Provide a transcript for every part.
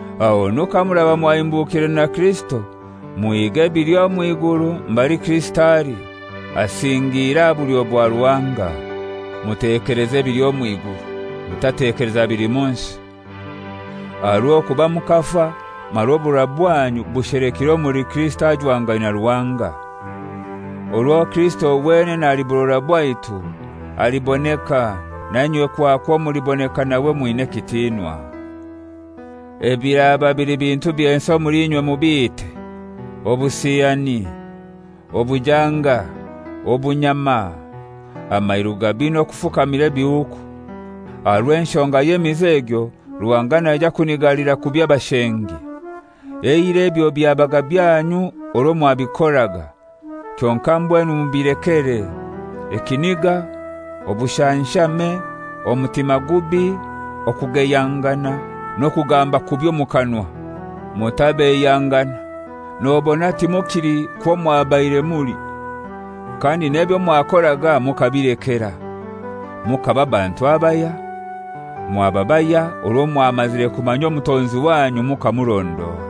Ahonu kamuraba mwahimbukire na Kirisito muhige ebili omwiguru, mbali Kirisito ali, asingiire aha bulyo bwa Ruhanga. Mutekeleze ebili omwiguru, mutatekeleza bili mu nsi. Aha rw'okuba mukafa, mara oburora bwanyu bushelekire omuli Kirisito ajwangaine na Ruhanga. Orwo Kirisito, wenene ali burora bwaitu, aliboneka, nainywe kwakwo muliboneka nawe mwina ekitinwa. Ebiraba bili bintu by'ensi omuli inywe mubiite: obusiyani, obujanga, obunyama, amairu gabi n'okufukamira ebihuuku. Aha rw'enshonga y'emize egyo Ruhanga naija kunigalira kubi abashengi. Eirai ebyo byabaga byanyu orwo mwabikoraga. Kyonkai mbwenu mubilekere: Ekiniga, obushanshame, omutima gubi, okugeyangana n'okugamba kubi omu kanwa. Mutabeiyangana, nobona timukili kwo mwabaire muli, kandi n'ebyo mwakoraga mukabilekera. Mukaba bantu abahya, mwaba bahya orwo mwamazire kumanya Omutonzi wanyu mukamurondora.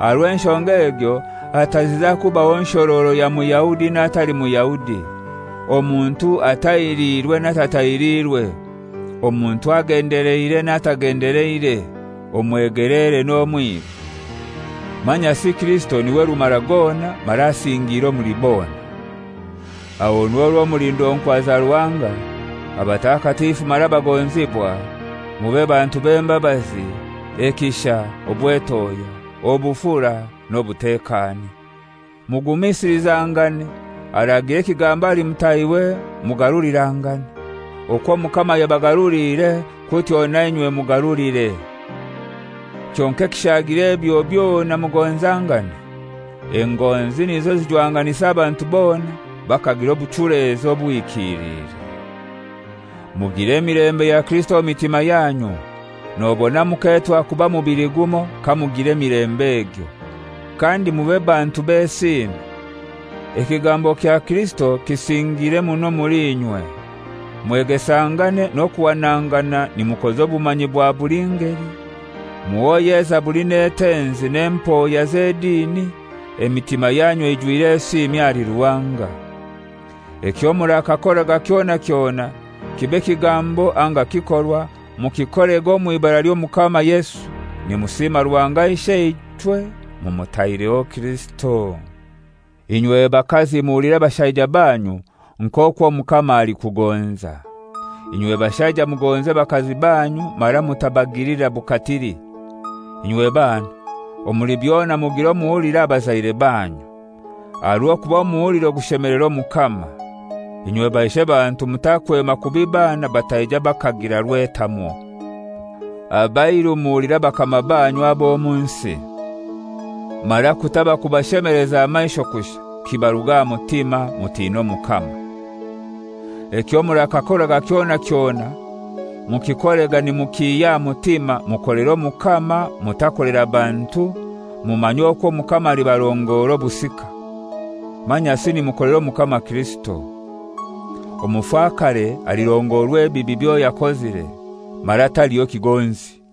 Aha rw'enshonga egyo, hataziza kubaho nshororo ya Muyahudi n'atali Muyahudi, omuntu atahiriirwe n'atatahiriirwe, omuntu agendeleire n'atagendeleire, omwegelere n'omwiru. Manyasi Kirisito niwe rumara gona, mara asingiire omuli bona. Ahonu orwo muli ndonkwa za Ruhanga, abatakatifu mara abagonzibwa, mube bantu b'embabazi, ekisha, obwetohya, obufura n'obutekani, mugumisilizangane, aragira ekigambo ahali mutahiwe mugarulirangane. Okwo Omukama yabagaruliire kutyo nainywe mugarulire. Kyonkai ekishaagire ebyo byona mugonzangane. Engonzi nizo zijwanganisa abantu bona bakagira obuchulezi obuhikilire. Mugire emilembe ya Kirisito omu mitima yanyu, nobona muketwa kuba mubili gumoi kamugira emilembe egyo. Kandi mube bantu b'esiimi. Ekigambo kya Kirisito kisingiire muno omuli inywe, mwegesangane n'okuhanangana nimukoza obumanyi bwa buli ngeli, muhoye ezaburi n'etenzi n'empoya z'edini emitima yanyu eijwire esiimi ahali Ruhanga. Ekyo murakakoraga kyona kyona, kibe kigambo anga kikorwa, mukikorega omw'ibara ly'Omukama Yesu, nimusima Ruhanga Isheichwe mumutaireho Kirisito. Inywe bakazi muhulire bashaija banyu nk'okwo Omukama alikugonza. Inywe bashaija mugonze bakazi banyu mara mutabagilira bukatili. Inywe bana, omuli byona mugire omuhuliro aha bazaire banyu, aha rw'okuba omuhuliro gushemelera Omukama. Inywe baishe bantu mutakwema kubi bana bataija bakagira rwetamwo. Abairu muhulire abakama banyu ab'omu nsi. Mara kutaba kubashemeleza aha maisho kushai, kibaruge aha mutima, mutine Omukama. Ekyo murakakoraga kyona kyona mukikorega nimukihya aha mutima, mukolere Omukama, mutakolera bantu, mumanye okwo Omukama alibarongora obusika. Manyasi nimukolera Omukama Kirisito. Omufakare alirongorwa ebibi byoyakozire, mara talibaho kigonzi.